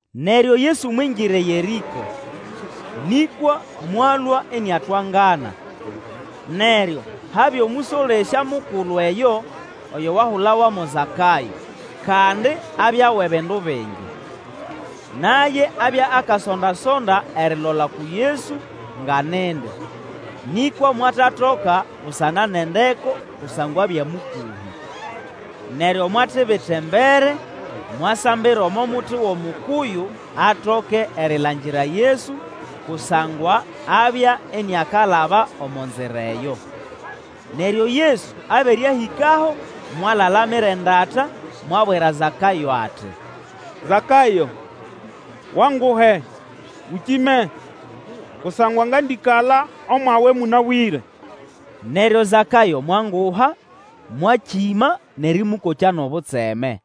Neryo Yesu mwingira eYerĩko, nĩkwa mwalũa iniatwangana. Neryo habya omũsolesya mukulu eyo, oyo wahulawa mo Zakayo, kandi abya wʼebindu bingi. Naye abya akasonda-sonda erilola uku Yesu nga nindi, nĩkwa mwatatoka busana nʼendeko kusangwa abya mũkũhĩ. Neryo mwatibita embere mwasambira omo muti wʼomukuyu atoke erilangira Yesu, kusangwa abya iniakalaba omo nzira eyo. Neryo Yesu abere ahĩkaho, mwalalamira endata mwabwira Zakayo ati, Zakayo, Wanguhe, ũkĩme, kusangwa ngandĩkala omwawe mũnabwĩre. Neryo Zakayo mwanguha, mwakĩma nʼerĩmũkokya nʼobutseme.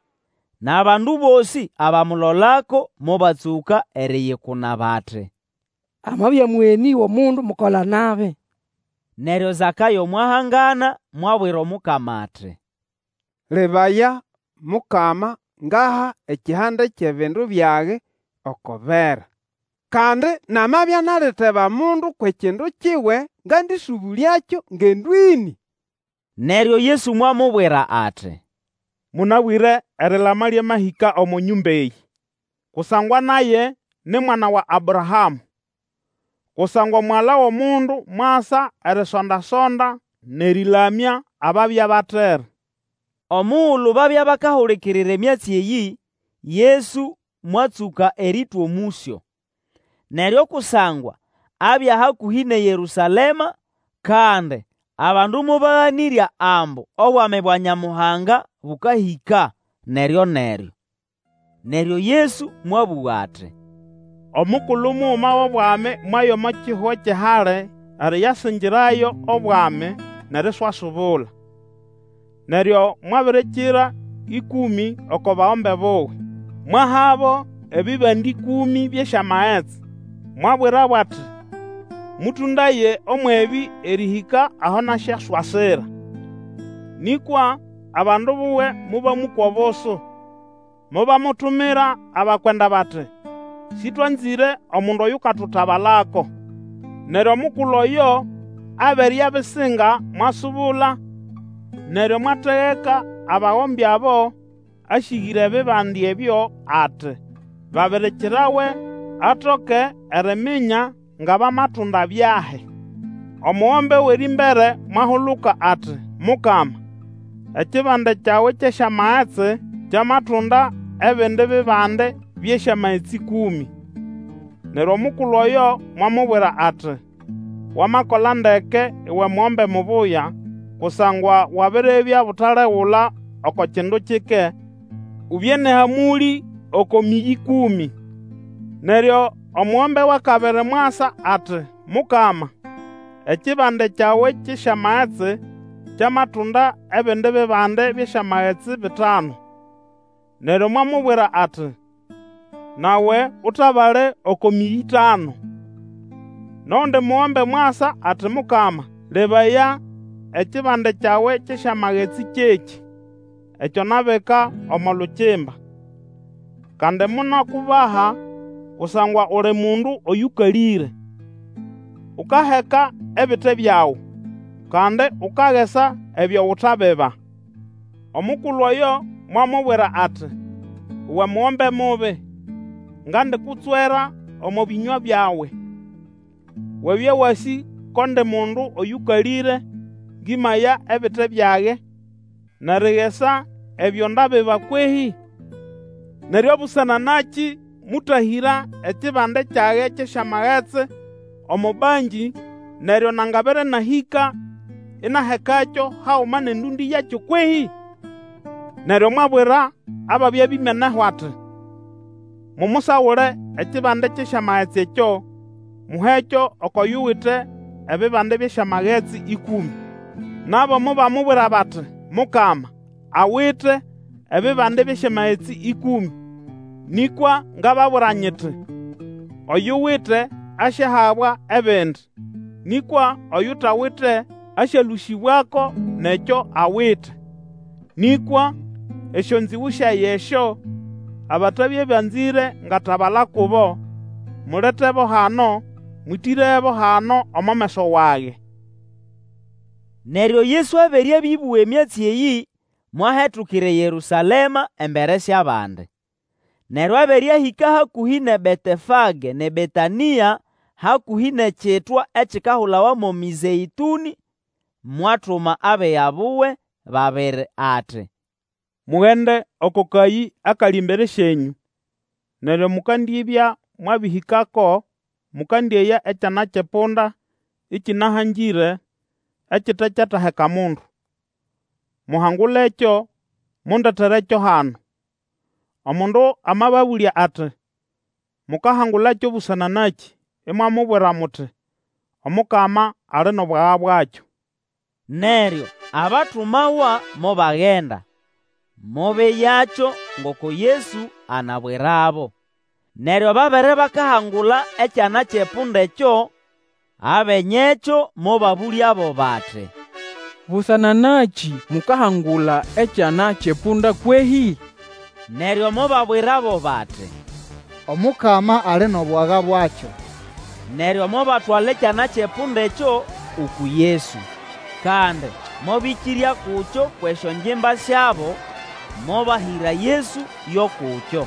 Nʼabandu bosĩ abamulolako mobatsũka eriyikuna bati, Amabya mũgenĩ wʼomundu mukola-nabi. Neryo Zakayo mwahangana mwabwira Omukama ati, Lebaya, Mukama, ngaha ekihande kyʼebindu byage oko bera; kandi namabya naliteba mundu kwʼekindu kiwe ngandĩsũbũlyakyo ngendo ĩnĩ. Neryo Yesu mwamubwira ati, Mũnabwĩre erilama lyamahĩka omo nyũmba eyĩ, kusangwa naye ni mwana wa Abrahamũ. Kusangwa Omugala wʼOmundu mwasa erisonda-sonda nʼerĩlamya ababya batere. Omugulu babya bakahulikirira emyatsi eyĩ, Yesu mwatsũka erĩtwa omũsyo. Neryo kusangwa abya hakũhĩ nʼeYerũsalema, kandi abandu mobaganĩrya ambu Obwami bwa Nyamuhanga bũkahĩka neryo-neryo. Neryo Yesu mwabũga ati, Omukulu muguma wʼobwami mwaya omo kihugo kyʼehali eriyasingirayo obwami, nʼeriswasubula. Neryo mwabirikira ĩkũmĩ oko bagombe buwe, mwahabo ebibande ĩkũmĩ byʼesyamagetsi, mwabwirabo ati, Mũtũndaye ũmwʼebĩ erĩhĩka aho nasyaswasira. Nĩkwa abandu buwe mobamũkwa obusu, mobamutumira abakwenda bati, Sĩtwanzĩre omundu oyukatutabalako. Neryo omukulu oyo abere abisinga mwasubula, neryo mwategeka abagombe abo asĩgĩra ebibande ebyo ati babirikirawe atoke eriminya nga bamatunda byahi. Omugombe wʼerĩmbere mwahuluka ati, Mukama, ekibande kyawe kyʼesyamagetsi kyamatunda ebindi bibande byʼesyamagetsi ĩkũmĩ. Neryo omukulu oyo mwamubwira ati, Wamakola ndeke uwe mugombe mubuya kusangwa wabiribya butalegula oko kindu kike, ubye nʼehamũlĩ oko mĩyĩ ĩkũmĩ. Neryo omugombe wʼakabiri mwasa ati, Mukama, ekibande kyawe kyʼesyamagetsi kyamatunda ebindi bibande byʼesyamagetsi bitanu. Neryo mwamubwira ati, Nawe utabale oko mĩyi ĩtanu. Nʼogundi mugombe mwasa ati, Mukama, lebaya ekibande kyawe kyʼesyamagetsi kyekĩ: ekyo nabika omo lukimba. Kandi monakubaha, kusangwa uli mundu oyũkalĩre. Ukaheka ebite byagu, kandi ukagesa ebyo utabiba. Omukulu oyo mwamubwira ati, Uwe mugombe mubi! Ngandikutswera omo bĩnywa byawe. Wabya wasĩ ko ndi mundu oyũkalĩre, ngĩmaya ebite byage, nʼerigesa ebyo ndabiba kwehĩ? Neryo busana nakĩ mũtahĩra ekibande kyage kyʼesyamagetsi omo bankĩ, neryo nangabere nahĩka, inahekakyo haguma nʼendũndĩ yakyo kwehĩ? Neryo mwabwira ababya bimeneho ati, Mumusagule ekibande kyʼesyamagetsi ekyo, muhekyo oko yuwite ebibande byʼesyamagetsi ĩkũmĩ. Nabo mobamubwira bati, Mukama, awite ebibande byʼesyamagetsi ĩkũmĩ! Nĩkwa ngababwira nyiti, Oyuwite asyahabwa ebindi, nĩkwa oyutawite, asyalũsĩbwako nʼekyo awite. Nĩkwa, esyonzĩgũ syage esyo, abatabya banzĩre ngatabala kubo, muletebo hano, mwĩtĩrebo hano omo meso wage. Neryo Yesu abere abĩbũga emyatsi eyĩ, mwahetukira eYerũsalema embere syʼabandi. Neryo abere ahĩka hakũhĩ nʼeBetefage nʼeBetanĩa, hakũhĩ nʼekitwa ekikahulawa mo Mĩzeĩtũnĩ, mwatuma abiga buwe babiri, ati, Mugende oko kayĩ akali embere syenyũ; neryo mukandibya mwabĩhĩkako mukandĩeya ekyana kyʼepunda ĩkĩnahangĩre ekitekyataheka mundu. Muhangulekyo, mundeterekyo hano. Omundu amababũlya ati, Mukahangulakyo busana nakĩ, imwamubwira muti, Omukama ali nʼobwaga bwakyo. Neryo abatuma wa mobagenda mobeyakyo ngoko Yesu anabwirabo. Neryo babere bakahangula ekyana kyʼepunda ekyo, abenyekyo mobabũlyabo bati, Busana nakĩ mukahangula ekyana kyʼepunda kwehĩ? Neryo mobabwirabo bati, Omukama ali nʼobwaga bwakyo. Neryo mobatwala ekyana kyʼepunda ekyo uku Yesu. Kandi mobĩkĩrya kukyo kwʼesyongimba syabo, mobahĩra Yesu yo kukyo.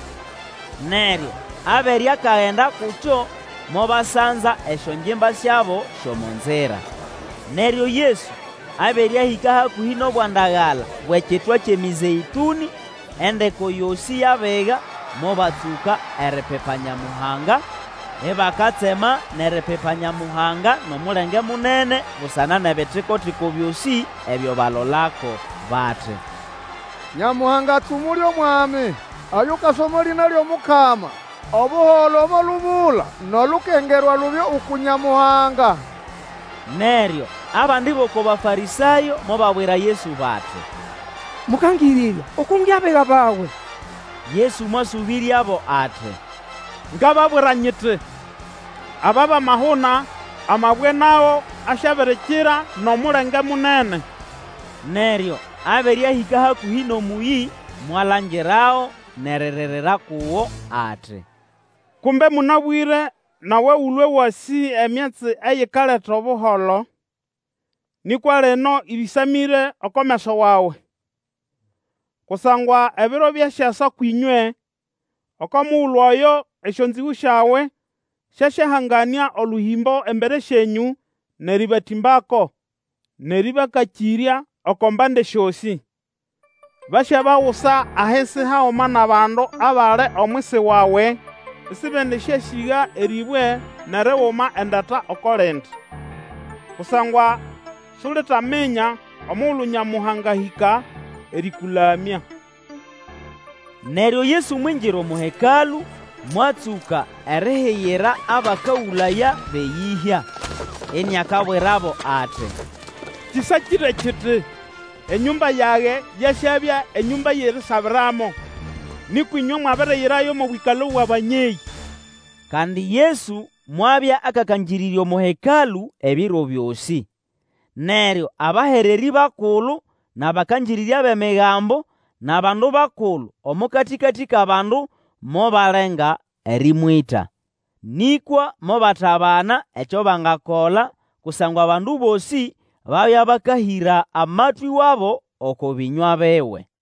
Neryo abere akagenda kukyo mobasanza esyongimba syabo syʼomo nzira. Neryo Yesu abere ahĩka hakũhĩ nʼobwandagala bwʼekitwa kyʼeMĩzeĩtũnĩ, endeko yosĩ yʼabiga mobatsũka eripipa Nyamuhanga ibakatsema nʼeripipa Nyamuhanga nʼomulenge munene busana nʼebitiko-tiko byosĩ ebyo balolako, bati, Nyamuhanga atsumule omwami, oyukasa omo lĩna lyʼomukama! Obuholo omo lubula nʼolukengerwa lubye uku Nyamuhanga! Neryo abandi bʼoko Bafarĩsayo mobabwira Yesu bati, Mũkangĩrĩrya, Ukunge abiga bawe. Yesu mwasũbĩryabo ati, Ngababwira nyiti, aba bamahuna, amabwe nago asyabirikira nʼomulenge munene. Neryo abere ahĩka hakũhĩ nʼomũyĩ, mwalangirago nʼeriririra kugo, ati, Kumbe mũnabwĩre nawe ũlwe wasĩ emyatsi eyikaleta Obuholo! Nĩkwa lino ĩbĩsamĩre oko meso wawe. Kusangwa ebiro byasyasa kwĩnywe, oko mugulu oyo esyonzĩgũ syawe syasyahanganĩa olũhĩmbo embere syenyũ nʼerĩbatĩmbako, nʼerĩbakakĩrya oko mbande syosĩ. Basyabagusa ahisi haguma nʼabandu abali omwisi wawe; isibendĩsyasĩga erĩbwe nʼeriguma endata oko lindi, kusangwa Sulitaminya omugulu Nyamuhanga ahĩka erĩkũlamya. Neryo Yesu mwingira omo Hekalũ, mwatsũka erihigira abakagũlaya bʼeyĩhya. Iniakabwirabo ati, Kĩsakĩre kiti, Enyũmba yage yasyabya enyũmba yʼerisabiramo. Nĩkwa ĩnywe mwabiriyirayo mo bwĩkalo bwʼabanyeyĩ. Kandi Yesu mwabya akakangĩrĩrya omo Hekalũ ebiro byosĩ. Neryo abahererĩ bakulu nʼabakangĩrĩrya bʼEmigambo nʼabandu bakulu omo katĩkatĩ kʼabandu mobalenga erĩmwĩta. Nĩkwa mobatabana ekyo bangakola, kusangwa abandu bosĩ babya bakahĩra amatwĩ wabo oko bĩnywa biwe.